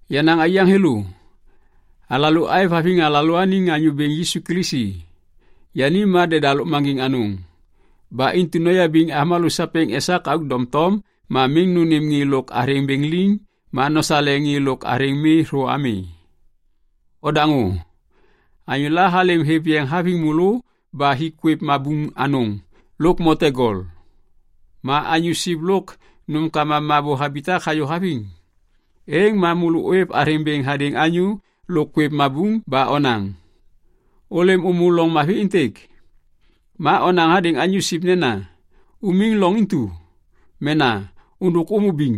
Yenaŋ aiyaŋ thêlô, alalô aêvhaviŋ alalôaniŋ Anyô Bêŋ Yisu Kilisi, yani ma deda lôkmaŋgiŋ anôŋ. Ba intu noyabiŋ avômalô sapêŋ esak auk doŋtom ma miŋ nônêm ŋê lôk athêŋ bêŋ liŋ ma nosale ŋê lôk athêŋ mi thô ami. Odaŋô. Anyôla halêm hêv yeŋ haviŋ môlô ba hik kwêv mabuŋ anôŋ lôk mote gol. Ma anyô siv lôk nômkama mabô habitak hayô haviŋ. Êŋ ma môlô ôêv athêŋ bêŋ hadêŋ anyô lôk kwêv mabuŋ ba onaŋ, “Ôlêm ômô loŋ mavi êntêk.” Ma onaŋ hadêŋ anyô siv nena, “Umiŋ loŋ intu” mena “Ôndôk ômô biŋ.”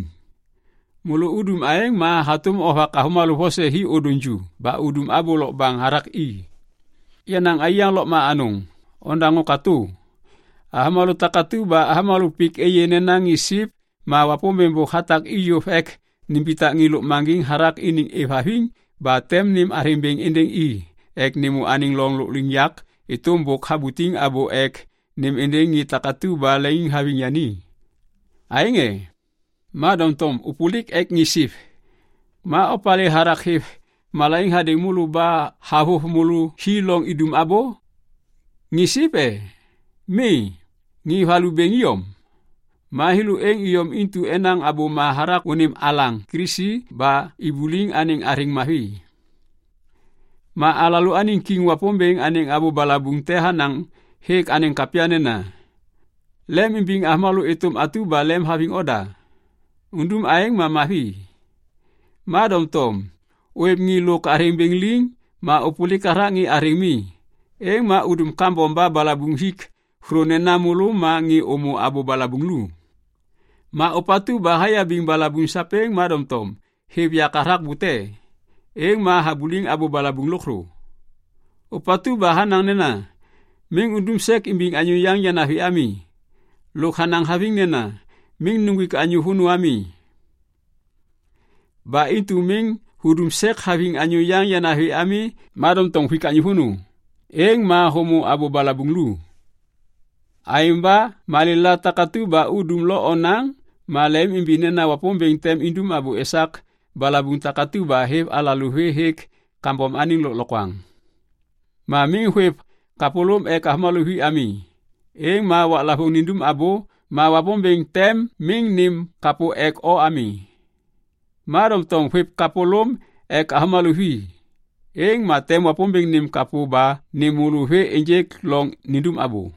Môlô udum aêŋ ma hatôm ovak avômalô vose hi ôdôŋ ju ba udum abô lokbaŋ hathak i. Yenaŋ aiyaŋ lôkma anôŋ, nodaŋô katô. Avômalô takatu ba avômalô pik êyê nena ŋê siv ma Wapômbêŋ bôk hatak i yôv ek nimbitak ŋê lôkmaŋgiŋ hathak iniŋ êvhaviŋ ba tem nêm athêŋ bêŋ êndêŋ i ek nêmô anêŋ loŋ lôkliŋyak êtôm bôk habutiŋ abô ek nêm êndêŋ ŋê takatu ba leŋiŋhaviŋ yani. Aêŋ e? Ma doŋtom ôpôlik ek ŋê siv. Ma opalê hathak hêv malaiŋ hadêŋ môlô ba havôv môlô hi loŋ idum abô? Ŋê siv e? Mi, ŋê valu bêŋ iyom. Ma thêlô êŋ iyom intu enaŋ abôma hathak unim alaŋ Kilisi ba ibuliŋ anêŋ athêŋ mavi. Ma alalôaniŋ kiŋ Wapômbêŋ anêŋ abô balabuŋ te hanaŋ hêk anêŋ kapya nena, “Lemimbiŋ avômalô êtôm atu ba lemhaviŋ oda”. Udum aêŋ ma mavi. Ma doŋtom ôêv ŋê lôk athêŋ bêŋ liŋ ma ôpôlik hathak ŋê athêŋ mi, êŋ ma udum kambom ba balabuŋ hik thô nena môlô ma ŋê ômô abô balabuŋ lu. Ma ôpatu ba hayabiŋ balabuŋ sapêŋ ma doŋtom hêv yak hathak bute, êŋ ma habuliŋ abô balabuŋ lôkthô. Ôpatu ba hanaŋ nena, “Miŋ undum sek imbiŋ anyô yaŋ yanavi ami” lôk hanaŋ haviŋ nena “Miŋ nuŋgwik anyô vônô ami.” Ba intu miŋ hudum sek haviŋ anyô yaŋ yanavi ami ma doŋtom huik anyô vônô, êŋ ma hômô abô balabuŋ lu. Aêŋ ba malêla takatu ba udum lo onaŋ ma lemimimbi nena Wapômbêŋ tem indum abô esak balabuŋ takatu ba hêv alalô vê hêk kambom anêŋ lôklokwaŋ. Ma miŋ hôêv kapôlôm ek avômalô vi ami, êŋ ma waklavôŋ nindum abô ma Wapômbêŋ tem miŋ nêm kapô ek o ami. Ma doŋtom hôêv kapôlôm ek avômalô vi, êŋ ma tem Wapômbêŋ nêm kapô ba nêm môlô vê ênjêk loŋ nindum abô.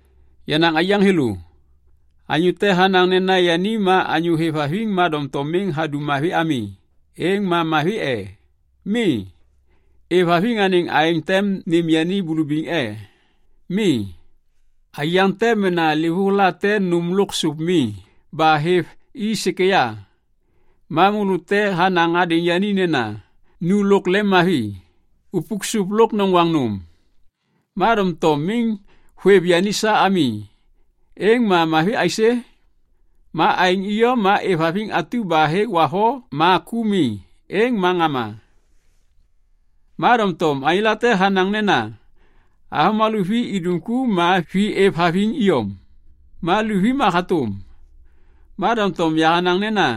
Yenaŋ aiyaŋ thêlô, anyô te hanaŋ nena yani ma anyô hêvhaviŋ ma doŋtom miŋ hadum mavi ami, êŋ ma mavi e? Mi. Êvhaviŋ anêŋ aêŋ tem nêm yani bulubiŋ e? Mi. Aiyaŋ te mena livôŋ late nôm lôk sôp mi ba hêv i sêkêya. Ma môlô te hanaŋ hadêŋ yani nena, “Nu lôk lemmavi, upuk sôp lôk noŋgwaŋ nôm.” Ma doŋtom miŋ hôêv yani sa ami, êŋ ma mavi aisê? Ma aêŋ iyom ma êvhaviŋ atu ba hêk wavo ma ku mi, êŋ ma ŋama. Ma doŋtom anyô late hanaŋ nena, “Avômalô vi idum ku ma vi êvhaviŋ iyom, ma luvi ma hatôm.” Ma doŋtom yahanaŋ nena,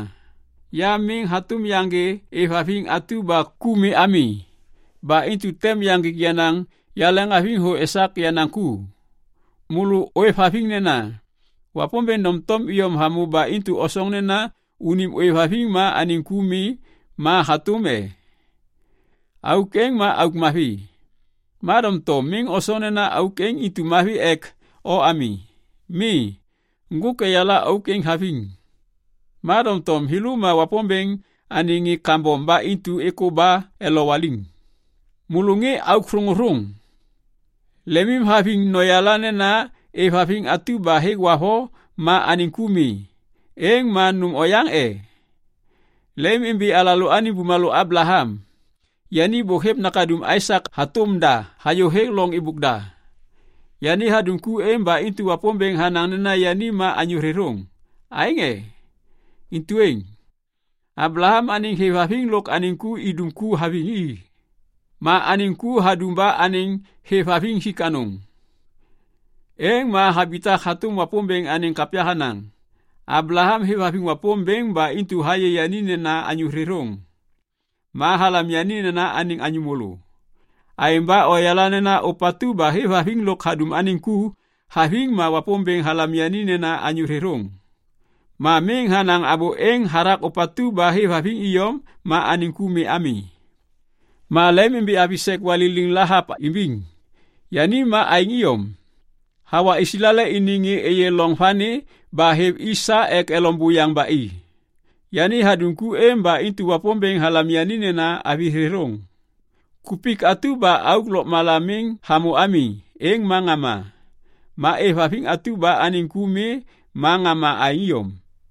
“Ya miŋ hatôm yaŋgê êvhaviŋ atu ba ku mi ami. Ba intu tem yaŋgik yenaŋ yahêvhaviŋ thô esak yenaŋ ku.” Môlô ôêvhaviŋ nena Wapômbêŋ doŋtom iyom hamô ba intu osoŋ nena unim ôêvhaviŋ ma anêŋ ku mi ma hatôm e? Auk êŋ ma auk mavi, ma doŋtom miŋ osoŋ nena auk êŋ intu mavi ek o ami. Mi, ŋgôk eyala auk êŋ haviŋ, ma doŋtom thêlô ma Wapômbêŋ anêŋ ŋê kambom ba intu êkô ba elowaliŋ. Môlô ŋê auk thôŋôthôŋ, lemimhaviŋ noyala nena êvhaviŋ atu ba hêk wavo ma anêŋ ku mi, êŋ ma nôm oyaŋ e? Lemimimbi alalôaniŋ bumalô Ablaham. Yani bôk hêv nakaduŋ Aisak hatôm da hayô hêk loŋ êbôk da. Yani hadum ku êŋ ba intu Wapômbêŋ hanaŋ nena yani ma anyô thêthôŋ, aêŋ e? Intu êŋ, Ablaham anêŋ hêvhaviŋ lôk anêŋ ku idum ku haviŋ i. Ma anêŋ ku hadum ba anêŋ hêvhaviŋ hik anôŋ. Êŋ ma habitak hatôm Wapômbêŋ anêŋ kapya hanaŋ, “Ablaham hêvhaviŋ Wapômbêŋ ba intu hayê yani nena anyô thêthôŋ.” Ma halam yani nena anêŋ anyô môlô. Aêŋ ba oyala nena ôpatu ba hêvhaviŋ lôk hadum anêŋ ku haviŋ ma Wapômbêŋ halam yani nena anyô thêthôŋ. Ma miŋ hanaŋ abô êŋ hathak ôpatu ba hêvhaviŋ iyom ma anêŋ ku mi ami. Ma lemimimbi avi sek waliliŋ Lahap imbiŋ. Yani ma aêŋ iyom. Hawa Islael iniŋ ŋê êyê loŋ vani ba hêv i sa ek elom buyaŋ ba i. Yani hadum ku êŋ ba intu Wapômbêŋ halam yani nena avi thêthôŋ. Kupik atu ba auk lôkmala miŋ hamô ami, êŋ ma ŋama. Ma êvhaviŋ atu ba anêŋ ku mi ma ŋama aêŋ iyom.